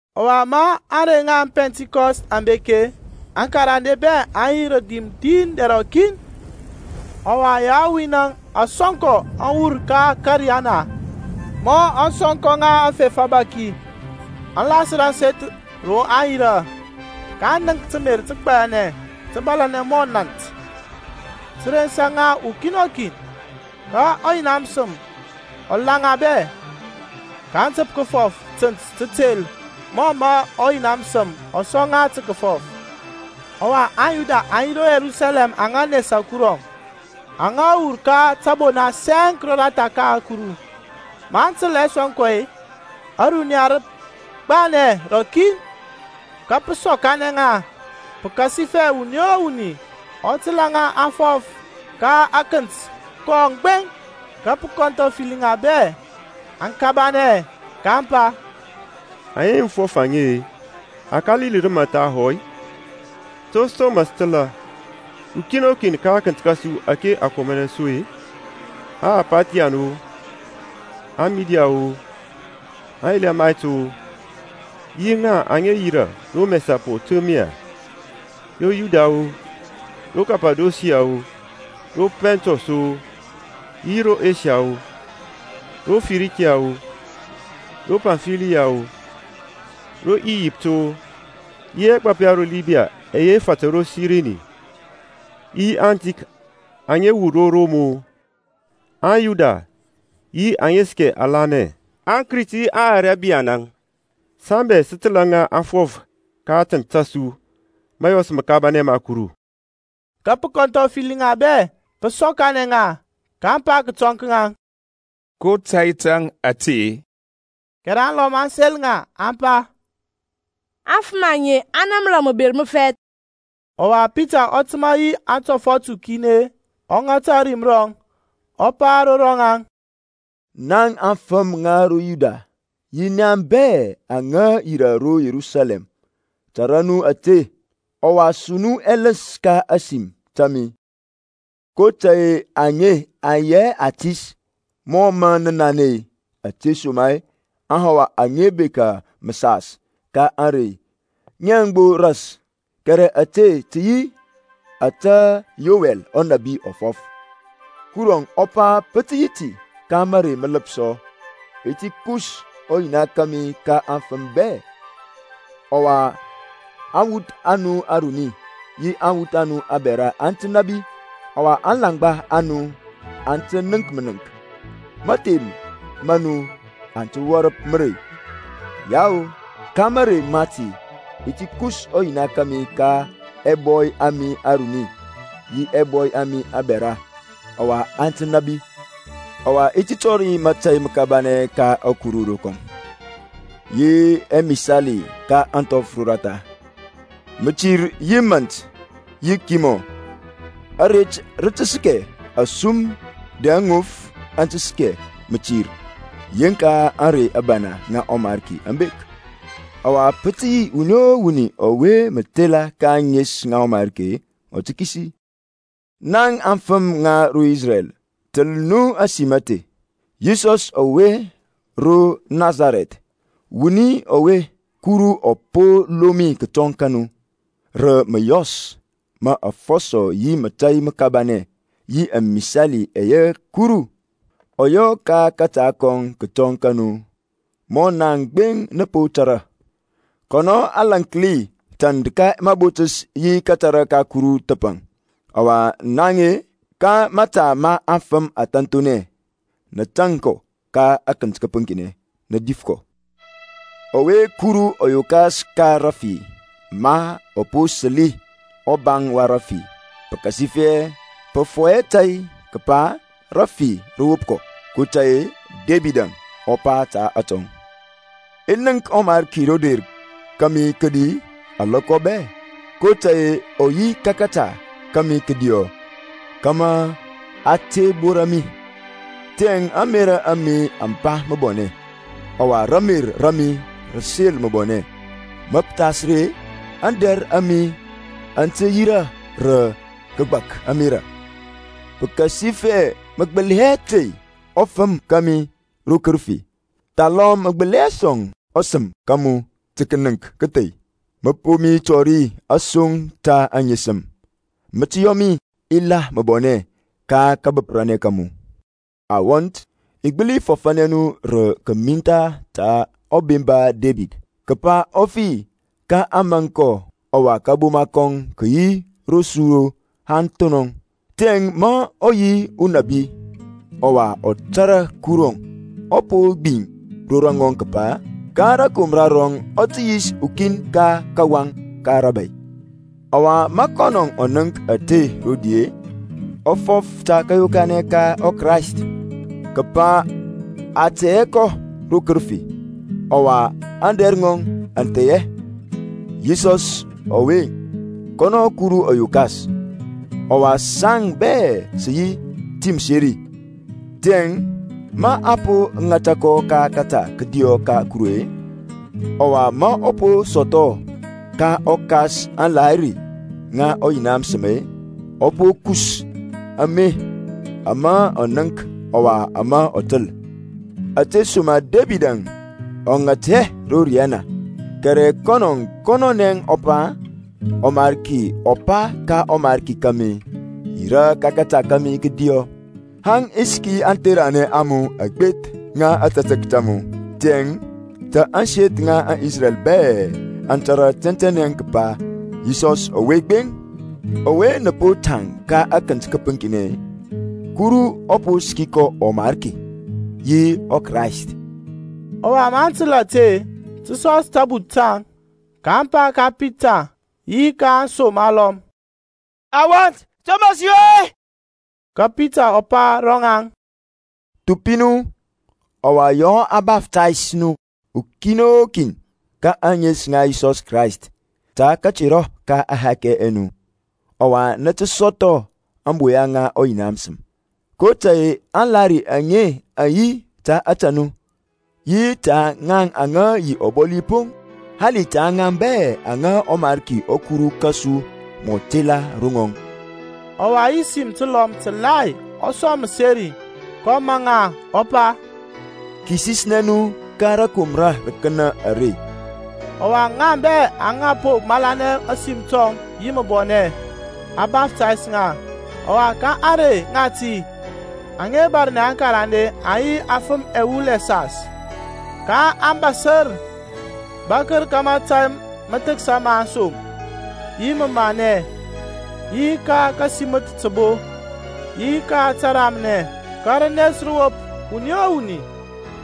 Ɔwa ma ȧŋrey ŋa ȧŋPɛntikɔst aŋ bek-e, aŋkarande bɛ aŋ yi rə dim din dɛr rɔkin. Ɔwa yawin-əŋ asɔnkɔ aŋ wur ka ȧkȧriyana mɔ aŋsɔnkɔ ŋa afef abȧki, aŋ lasər ȧŋseth ro aŋ yirȧ. kaŋ nənk təmer təgbayanɛ tə bȧlȧnɛ mɔ nȧnt, tə rensa ŋa ukin o kin. Ka ɔYina məsəm ɔ la ŋa bɛ, kaŋ təp kəfɔf tənt tətel mɔ mə ɔYina məsəm ɔ sɔŋ ŋa tə kəfɔf. Ɔwa aŋYuda aŋ yi ro Yerusalɛm aŋa nesa Kurɔŋ, aŋa wur ka tȧbona sɛŋk roratha ka ȧkuru. Maŋ təl ɛsɔnkɔ ɛye-e, ȧruniya rə gbanɛ rɔkin, ka pə sɔkanɛ ŋa pəkasifɛ wuni o wuni ɔ təlȧ ŋa aŋ fɔf ka akənt kɔŋ gbeŋ. Ka pə kɔnthɔfəli ŋa bɛ, aŋ kabanɛ, kaŋ pa, Aŋe mə fɔf-e, aŋe aKalili rəmaŋ thahɔ-i? To som mə sə təlȧ, ukin o kin ka akənt kȧsu ȧke a komanɛ su-e? Aparthian-o, aMid-o, aƐlamayt-o, yi aŋa yirȧ ro Mɛsapotemiya, ro Yudiya-o, ro Kapadosiya-o, ro Pɔntɔs-o, yi ro Esiya-o, ro Fərikiya-o, ro Pamfiliya-o, ro Iyipt-o, yi ɛgbap ya ro Libiya ɛyɛ fatər ro Sirini, yi aŋtik aŋa wur ro Rom-o, aYuda yi aŋa səkɛ alanɛ, aKrit yi aŋArabiyanȧŋ, saŋ bɛ sə təlȧ ŋa aŋ fɔf ka atənt ta su mȧyɔs məkabanɛ ma Kuru. Ka pə kɔnthɔfəli ŋa bɛ, pə sɔkanɛ ŋa, ka aŋ pa kətɔŋ ka ŋaŋ, ko tȧy tȧŋ ȧte-e? Kɛrɛ alɔm aŋ sel ŋa aŋ pa, Aŋfəm aŋe aŋ namra məber məfɛth. Ɔwa Pitaŋ ɔ təmȧ yi antɔfɔt ukin-e ŋata ȧrim rɔŋ, ɔ pa ro rɔŋaŋ, na aŋfəm ŋa ro Yuda yi nia bɛ aŋa yirȧ ro Yerusalɛm, tȧrȧ nu ȧte, ɔwa su nu ɛləns ka ȧsim ta mi. kotȧy-e aŋe aŋ yi hɛ atis, mɔ mə nə nanɛ-e, ȧtesoma-e aŋhawa aŋa bekȧ məsas ka ȧŋrey ŋiəŋ gbo ras. Kɛrɛ ȧte tə yi ȧtȧ Yowɛl ɔnȧbi ɔ fɔf, Kurɔŋ ɔ pa, Pə tə yi ka marey mələpsɔ, I ti kus ɔ Yina kȧmi ka afəm bɛ, Ɔwa aŋwuth a nu aruni yi aŋwuth a nu abɛra aŋ tə nȧbi, Ɔwa aŋlaŋgba a nu aŋ tə nənk mənənk, Maȧhem ma nu aŋ tə wɔrəp mərey; Yao ka marey mati i ti kus ɔYina kȧmi ka ɛbɔy ɛ mi aruni, Yi ka ɛbɔy ɛ mi abɛra, ɔwa aŋ tə nȧbi. Ɔwa i ti tɔri mȧtȧy məkabanɛ ka ȧkuru rokɔm, Yi ɛmisali ka ȧŋthɔf roratha; Mətir yi nȧnt yi kimɔ. Aret tə tə səkɛ asum dɛ aŋof aŋ tə səkɛ mətir Yeŋka ȧŋrey abana ŋa ɔMarki aŋ bek. Ɔwa pə tə yi wuni o wuni ɔwe mə tela ka ȧŋes ŋa ɔMarki ɔ tə kisi. Naŋ aŋfəm ŋa ro Isrɛl, təl nu ȧsim ȧte. Yisɔs ɔwe ro Nasarɛth, wuni ɔwe Kuru ɔ po lomi kətɔŋ ka nu rə məyɔs ma afɔsɔ yi mȧtȧy məkabanɛ yi ɛmisali ɛyɛ Kuru ɔ yɔ ka kȧta kɔŋ kətɔŋ ka nu, mɔ naŋ gbeŋ nə po tȧrȧ. Kɔnɔ a lȧnki tand ka mabotəs yi kȧtȧrȧ ka Kuru thəpaŋ, ɔwa naŋ-e, ka mȧta ma afəm ȧthȧnthonɛ, nə tȧŋ kɔ ka akənt kəpəŋkinɛ, nə dif kɔ. Ɔwe Kuru ɔ yokas ka rəfi ma ɔ po səli ɔbaŋ wa rəfi, pəkasifɛ pə fɔyɛ tȧy kəpa rafi rə wop kɔ. kotȧy-e Debid ɔ pa ta atɔŋ, I nənk ɔMarki ro der kȧmi kədi alɔkɔ bɛ, kotȧy-e ɔ yi ka kȧta kȧmi kədiɔ, Kama a te bora mi. Tiyȧŋ ȧŋmerȧ a mi aŋ ba məbɔnɛ, Ɔwa ramer ra mi rə sel məbɔnɛ. Ma pə thas ri-e, ȧŋdɛr a mi aŋ tə yirȧ rə kəgbak ȧmerȧ; Pəkasifɛ mə gbəli hɛ tey ɔfəm ɔ mi ro kərəfi, Thalɔm mə gbəli hɛ sɔŋ ɔSəm ka mu tə kənəŋk kȧthey. Mə po mi tɔri asoŋ ta aŋesəm. Mə tə yɔ mi i la məbɔnɛ ka kȧbəprȧnɛ ka mu. Awɔnt, i gbəli fɔfȧnɛ nu rə kəmintha ta ɔbemba Debid, kəpa ɔ fi, ka a maŋk kɔ, ɔwa kȧboma kɔŋ kə yi ro su haŋ thonɔŋ. Tiyȧŋ ma ɔ yi unabi, ɔwa ɔ tȧrȧ Kurɔŋ ɔ po gbiŋ ro rɔŋɔŋ kəpa, ka rȧkomra rɔŋ ɔ tə yis ukin ka kawaŋ ka rȧbȧy. Ɔwa ma kɔnɔ ɔ nənk ȧte rodi-e, ɔ fɔf ta kȧyokanɛ ka ɔKrayst, kəpa a tey hɛ kɔ ro kərəfi, ɔwa ȧŋdɛr ŋɔŋ aŋ thei hɛ. Yisɔs ɔwe-əŋ, kɔnɔ Kuru ɔ yokas, ɔwa saŋ bɛ sə yi ti məseri. Tiyȧŋ ma a po ŋata kɔ ka kȧta kədiɔ ka Kuru-e, ɔwa ma ɔ po sɔthɔ ka ɔKas aŋlahiri ŋa ɔYina məsəm-e, ɔ po kus ame, ama nə nənk, ɔwa ama nə təl. Ȧtesoma-e Debid ɔ ŋat hɛ ro riyana, kɛrɛ kɔn kɔnɔnɛ ɔ pa, ƆMariki ɔ pa ka ɔMarki kȧmi, Yirȧ ka kȧta kȧmi kədiɔ, Haŋ i səki antheranɛ a mu agbeth ŋa ȧtȧtək ta mu. Tiyȧŋ ta ȧŋseth ŋa Isrɛl bɛ aŋ tȧrȧ tɛntɛnɛ kəpa, Yisɔs ɔwe gbeŋ, ɔwe nə po tȧŋ ka akənt kəpəŋkinɛ-e, Kuru ɔ po səki kɔ ɔMarki yi ɔKrayst. Ɔwa maŋ təl ȧte-e, tə sɔs tabuth taŋ, ka aŋ pa ka Pita yi ka aŋsom alɔm, Awɔnt, to mə sə yɔ-i? Ka Pitaŋ ɔ pa ro ŋaŋ, Thupi nu, ɔwa yɔ a baftays nu kin o kin ka ȧŋes ŋa Yisɔs Krayst ta katerɔ ka ɛhakɛ ɛ nu, ɔwa nə tə sɔthɔ ȧŋboya ŋa ɔYina məsəm. kotȧy-e aŋlahiri aŋe aŋ yi ta ȧtȧ nu, yi ta aŋwuth a nu yi ta ŋaŋ aŋa yi ɔbɔli poŋ, hali ta ŋaŋ bɛ aŋa ɔMarki ɔKuru kȧsu mɔ tela ro rɔŋɔŋ. Ɔwa yi sim təlɔm təlai ɔ sɔŋ məseri, kɔ maŋ ŋa, ɔ pa, Kisisnɛ nu ka rȧkomra rəkənȧ are. Ɔwa ŋaŋ bɛ aŋa po malanɛ ȧsim tɔŋ yi məbɔnɛ, a baftays ŋa; ɔwa ka ȧŋrey ŋati aŋa bȧrnɛ aŋkarande aŋ yi afəm ɛwul ɛsas. kaŋ bȧsər bȧkər ka mȧtȧy məthəksa ma aŋsom, yi məmanɛ, yi ka kasiməth təbo, yi ka təramnɛ. Ka rənes rə wop wuni o wuni;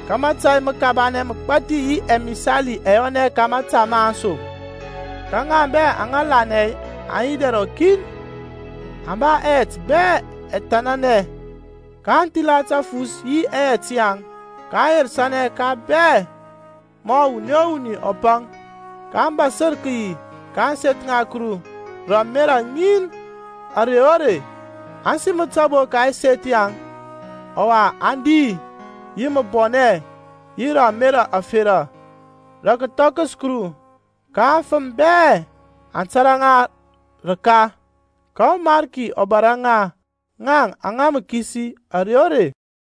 ka mȧtȧy məkabanɛ məgbathi yi ɛmisali ɛ yɔnɛ ka mȧta ma aŋsom. Ka ŋa bɛ aŋa lanɛ aŋ yi dɛr rɔkin, aŋ ba ɛyɛt bɛ ɔthənanɛ. kaŋ thila tafus yi ɛyɛt yaŋ, kaŋ yerəsanɛ ka ŋa bɛ mɔ wuni o wuni ɔ paŋ. kaŋ bȧsər kəyi ka ȧŋseth ŋa Kuru rə ȧmerȧ ŋin ȧrey o rey, aŋ siməth təbo ka ɛseth yaŋ, ɔwa aŋ di yi məbɔnɛ yi rə ȧmerȧ ȧferȧ, rə kəthɔkəs Kuru. Ka aŋfəm bɛ aŋ tȧrȧ ŋa rəka. Ka ɔMarki ɔ bȧrȧ ŋa ŋaŋ aŋa mə kisi ȧrey o rey.